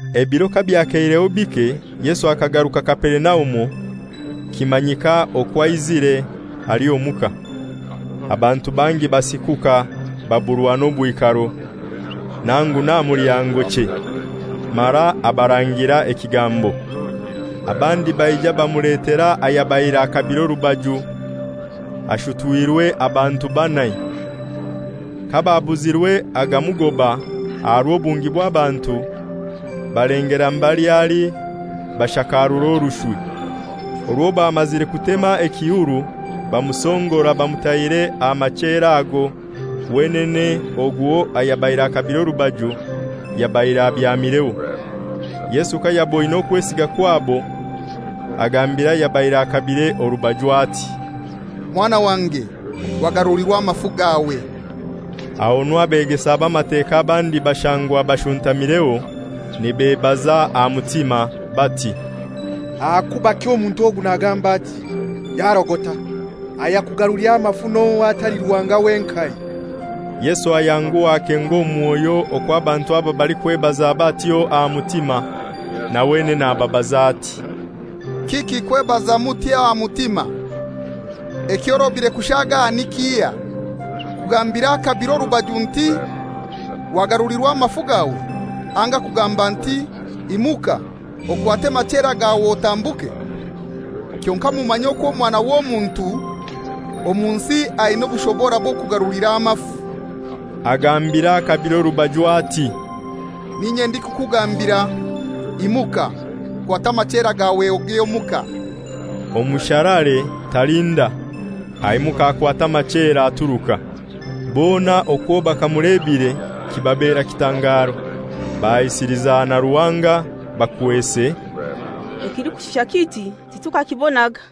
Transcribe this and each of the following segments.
Ebiro kabyakeireho bike Yesu akagaruka Kaperinaumu, kimanyika okwo aizire, ali omuka. Abantu bangi basikuka baburwa n'obwikaro, nangu n'aha mulyango chei; mara abarangira ekigambo. Abandi baija bamuletera ayabaire akabire orubaju, ashutwirwe abantu banai. Kababuzirwe agamugoba aha rw'obungi bw'abantu, balengelera mbali ali bashakarura orushwi. Orwo bamazire kutema ekihuru bamusongora bamutaire aha machera ago wenene ogwo ayabaire akabire orubaju yabaire abyamireho. Yesu kayaboine okwesiga kwabo, agambira ayabaire akabire orubaju ati, «Mwana wange, wagarulirwa amafu gawe.» Ahonu abegesa b'Amateka abandi bashangwa bashuntamireho, nibebaza aha mutima bati, «Ahakubaki omuntu ogu nagamba ati? Yarogota! Ayakugarulira amafu n'ohai atali Ruhanga wenkai?» Yesu ayanguha akenga omu mwoyo okwo abantu aba balikwebaza batyo aha mutima, na wenene ababaza ati, «Kiki kwebaza mutyo aha mutima? Ekyorobire kushaaga ni kihai, kugambira akabire orubaju nti, ‹Wagarulirwa amafu gawe,› anga kugamba nti, ‹Imuka, okwate amachera gawe otambuke?› Kyonkai mumanye okwo Omwana w'Omuntu omu nsi aina obushobora bw'okugarulira amafu,» nagambira akabire orubaju ati, «N'inye ndikukugambira, imuka, kwata amachera gawe ogye omuka.» Omusharaare talinda, aimuka akwata amachera aturuka. Bona okwo bakamulebire, kibabera kitangaro, bahaisiliza na Ruhanga bakwese, «Ekilikushusha kiti titukakibonaga.»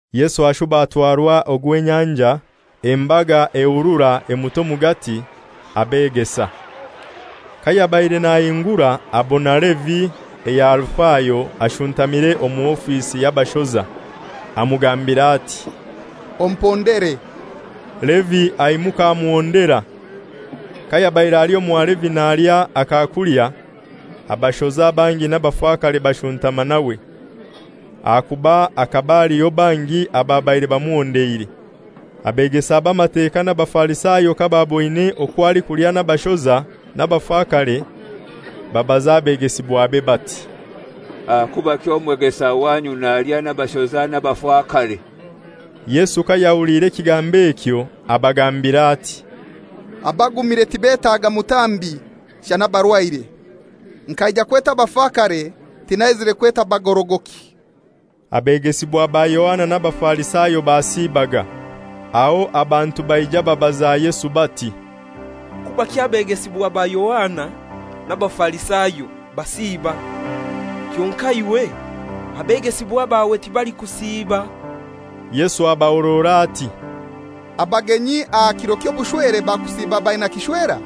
Yesu ashuba atwarwa ogw'enyanja, embaga ehurura emuta omugati. Abegesa. Kayabaire nahingura abona Levi eya Alifayo ashuntamire omu ofisi y'abashoza, amugambira ati, «Ompondere.» Levi aimuka amuhondera. Kayabaire ali omwa Levi nalya akakulya, abashoza bangi n'abafakare bashuntama nawe, ahakuba hakaba haliho bangi ababaire bamuhondeire. Abegesa b'Amateka n'Abafarisayo kababoine okwo alikulya n'abashoza n'abafakare, babaza abegesibwabe bati, «Ahakubaki omwegesa wanyu nalya n'abaashoza n'abafakare?» Yesu kayahuliire ekigambo ekyo abagambira ati, «Abagumire tibetaaga mutambi, shana abarwaire. Nkaija kweta abafakare, tinaizire kweta bagorogoki.» Abegesibwa ba Yohana n'Abafarisayo basiibaga. Aho abantu baija babaza Yesu bati, «Kubaki abegesibwa ba Yohana n'Abafarisayo basiiba, kyonkai iwe abegesibwa bawe tibalikusiiba?» Yesu abahorora ati, «Abagenyi aha kiro ky'obushwere bakusiiba baina kishwera?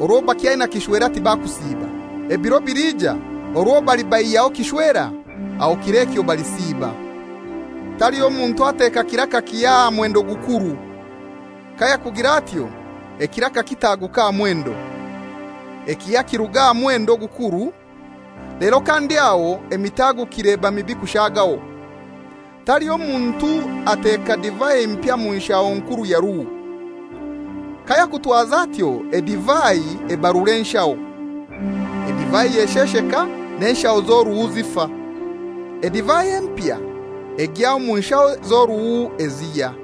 Orwo bakyaina kishwera tibakusiiba. Ebiro biliija orwo balibaihyaho kishwera, aho kir'ekyo balisiiba. Taliho muntu ateka kiraka kihya aha mwendo gukuru. Kayakugira atyo ekiraka kitaguka aha mwendo, ekihya kiruga aha mwendo ogukuru, lero kandi aho emitagukire eba mibi kushagaho. Taliho muntu ateka divai mpya mu nshaho nkuru ya ruhu. Kayakutwaza atyo edivai ebarura enshaho, edivai eshesheka, n'enshaho z'oruhu zifa. Edivai empya egya omu nshaho z'oruhu ezihya.»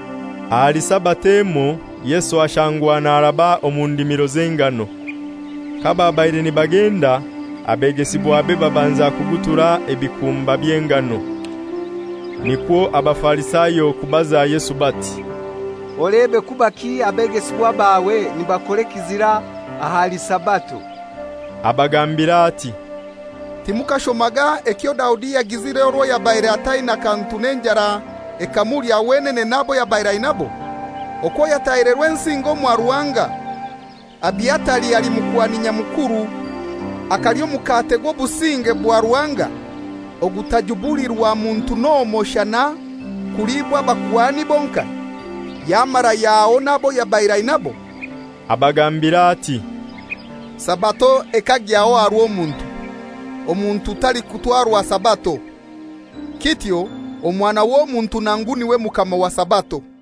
Ahali Sabato emoi Yesu ashangwa naraba omu ndimiro z'engano. Kababaire nibagenda, abegesibwabe babanza kugutura ebikumba by'engano. Nikwo Abafarisayo kubaza Yesu bati, «Olebe, kubaki abegesibwa bawe nibakora ekizira ahali Sabato?» Abagambira ati, «Timukashomaga ekyo Daudi yagizire orwo yabaire ataina kantu n'enjara ekamulya wenene n'abo yabaire ainabo: okwo yatahire Rwensinga omwa Ruhanga, Abiatari ali Mukuhani Nyamukuru, akalya Omukate gw'Obusinge bwa Ruhanga, ogutajubulirwa muntu n'omoi shana kuliibwa abakuhani bonkai, yamara yahaho n'abo yabaire ainabo?» Abagambira ati, «Sabato ekagyaho aha rw'omuntu, omuntu talikutwarwa Sabato. Kityo Omwana w'Omuntu nangu n'iwe Mukama wa Sabato.»